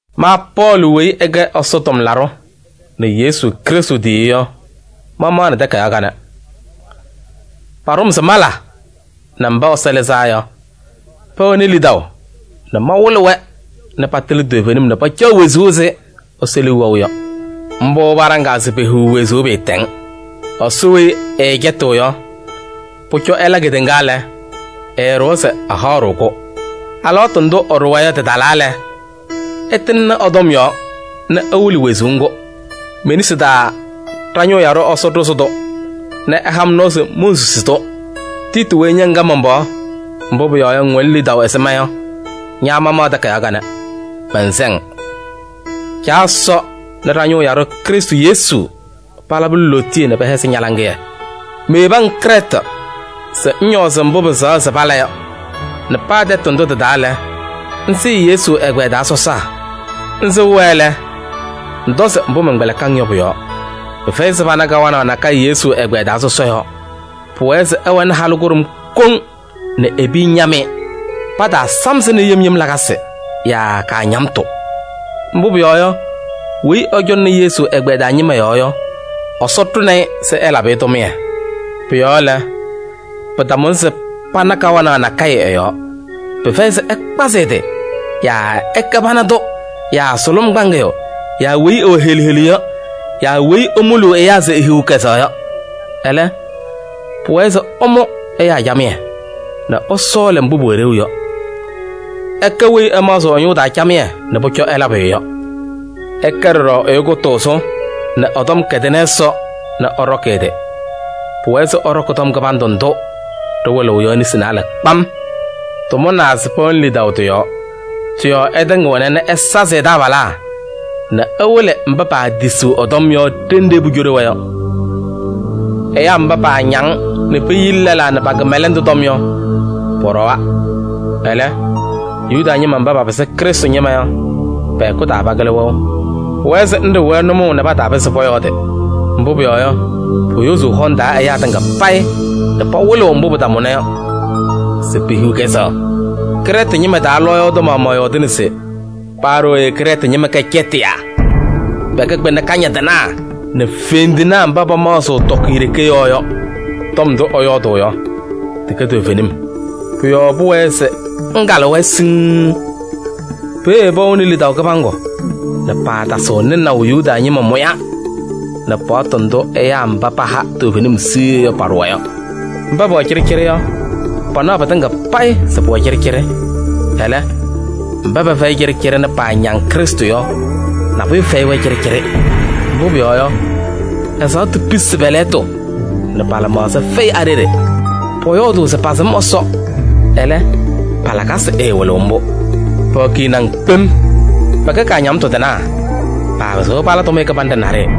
Ma Pɔɔlɩ weyi ɛkɛ Ɛsɔ tʋmlaɖʋ nɛ Yesu Krɩstʋ tiyiyu yɔ, mamaɣnɩ takayaɣ kanɛ. Paɖʋ-m se mala nɛ mba Ɛsɔ lɩzaa yɔ, pɛwɛnɩ lidaʋ nɛ mawɩlɩ-wɛ nɛ patɩlɩ toovenim nɛ pacaɣ wezuu ɛzɩ Ɛsɔ liu wɛʋ yɔ. Mbʋ paɖaŋaa se pehiɣ wezuu pɩɩtɛŋ. Ɛsɔ weyi ɛɛcɛtɩɣ yɔ, pʋcɔ ɛla kedeŋa lɛ, ɛɛɖʋwa se ɛhaɣ-ɖʋ-kʋ. Alɩwaatʋ ndʋ ɛɖʋwa yɔ tɩtalaa lɛ, ɛtɩŋnɩ ɛ-tɔm yɔɔ nɛ ɛwɩlɩ wezuu ŋgʋ. Me-nesi taa ɖa-ñʋʋ yaɖʋ Ɛsɔ ɖʋzɩ-tʋ nɛ ɛha-m nɔɔ se monsusi-tʋ. Tiiti weyi ña ŋkɛ man-pɩɣa, mbʋ pʋyɔɔ yɔ, ŋwɛnɩ lidaʋ ɛzɩ ma yɔ, ña mamaɣ takayaɣ kanɛ, mɛnsɛ-ŋ: Caa Ɛsɔ nɛ ɖa-ñʋʋ yaɖʋ Krɩstʋ Yesu palabɩ-ŋ lootiye nɛ pɛhɛzɩ ña-laŋɩyɛ. Meyebi-ŋ Krɛɛtɩ se ŋñɔɔzɩ mbʋ pɩsɛɣa se pala yɔ nɛ paa tɛtʋ ndʋ tɩ-taa lɛ, ŋsɩɩ Yesu ɛgbɛyɛ taa sɔsaa. Ŋsɩɣ-wɛ lɛ, ŋtɔzɩ mbʋ mɛnkpɛlɩkɩ-ŋ yɔ pʋ-yɔɔ: pɩfɛyɩ se pana kawanaɣ nakɛyɛ Yesu ɛgbɛyɛ taa sɔsɔ yɔɔ. Pʋwɛɛ se ɛwɛnɩ halʋ kʋɖʋm koŋ nɛ e-piya ñam-ɩ. Pataasam-sɩ nɛ yem yem lakasɩ yaa kaañamtʋ. Mbʋ pʋyɔɔ yɔ, weyi ɛcɔŋnɩ Yesu ɛgbɛyɛ taa ñɩma yɔɔ yɔ, Ɛsɔ ɖʋnɩ-ɩ se ɛlabɩ-ɩ tʋmɩyɛ. Pʋ-yɔɔ lɛ, pɩtamʋnɩ se pana kawanaɣ nakɛyɛ ɛ-yɔɔ. Pɩfɛyɩ se ɛkpazɩ ɛ-tɩ yaa ɛkɛ pana tʋ yaa sʋlʋm kpaŋɩyʋ yaa weyi ɛwɛ helu helu yɔ yaa weyi emuluu ɛyaa se ehiɣ kɛzɛɣ yɔ. Ɛlɛ, pʋwɛɛ se ɛmʋ ɛyaa camɩyɛ nɛ ɛsɔɔlɩ mbʋ pʋwɛ ɖeu yɔ. Ɛkɛ weyi ɛmaɣzɩɣ ɛ-ñʋʋ taa camɩyɛ nɛ pʋcɔ ɛla pʋyʋ yɔ. Ɛkɛ ɖɔɖɔ ɛyʋ kʋtʋʋzʋ nɛ ɛ-tɔm kɛdɩnɩ Ɛsɔ nɛ ɛɖɔkɩ ɛ-tɩ. Pʋwɛɛ se ɛɖɔkɩ tɔm kɩbandʋ ndʋ ɖɩwɩlɩɣ yɔ nesi naalɛ kpam. Tɩmʋnaa se pɛwɛnɩ lidaʋ tɩ-yɔɔ. Tɩ-yɔɔ ɛtɩŋɩɣna nɛ ɛsazɩ ɛ-taabalaa nɛ ɛwɩlɩ mba paatisiɣ ɛ-tɔm yɔ ɖenɖe pucoɖi-wɛ yɔ. Ɛyaa mba paañaŋ nɛ peyili lɛlaa nɛ pa-kɩmɛlɛndʋ tɔm yɔ, pɔɖɔwa. Ɛlɛ, Yuda ñɩma mba papɩsɩ Krɩstʋ ñɩma yɔ, pɛ-hɛkʋ taa pakɩlɩ wɛʋ. Pʋwɛɛ se ŋɖɩɣ-wɛ nʋmɔʋ nɛ pataapɩzɩ pɔyɔɔdɩ. Mbʋ pʋyɔɔ yɔ, poyozuu hɔŋ taa ɛyaa tɩŋa payɩ nɛ pawɩlɩɣ mbʋ pɩtamʋna yɔ se pehiɣ kɛzɛɣ. Krɛɛtɩ ñɩma taa lɔɔyaɣ tʋ maɣmaɣ yɔɔdɩnɩ se: “Paa ɖooye Krɛɛtɩ ñɩma kɛ cɛtɩyaa, pɛkɛ kpɩna kañadɩnaa nɛ fendinaa mba pamaɣzɩɣ tɔkɩyɛ ɖeke yɔɔ yɔ.” Tɔm ndʋ ɛyɔɔdʋʋ yɔ, tɩkɛ toovenim. Pʋ-yɔɔ pʋwɛɛ se ŋkalɩ-wɛ siŋŋ. Peeye pɛwɛɣnɩ lidaʋ kɩbaŋgʋ nɛ paatasɩɣ nɩnaʋ Yuda ñɩma mʋya nɛ paɣtʋ ndʋ ɛyaa mba paha toovenim siɣye yɔ paɖʋwa yɔ. Mba pɛwɛ cɩɖɩcɩɖɩ yɔ, panaɣ pɩtɩŋa payɩ se pʋwɛ cɩɖɩcɩɖɩ. Ɛlɛ, mba pɛfɛyɩ cɩɖɩcɩɖɩ nɛ paañaŋ Krɩstʋ yɔ, nabʋyʋ fɛyɩ-wɛ cɩɖɩcɩɖɩ. Mbʋ pʋyɔɔ yɔ, ɛzaɣtʋ pisi pɛ-lɛɣtʋ nɛ pa-lɩmaɣza fɛyɩ a-ɖeɖe. Pɔyɔɔdʋʋ se pasɩm Ɛsɔ, ɛlɛ, pa-lakasɩ ɛɛwɩlɩɣ mbʋ. Pɛwɛ kiniŋ kpem, pɛkɛ kaañamtʋ tɩnaa, paapɩzɩɣ pala tʋmɩyɛ kɩbanɖɛ naɖɩyɛ.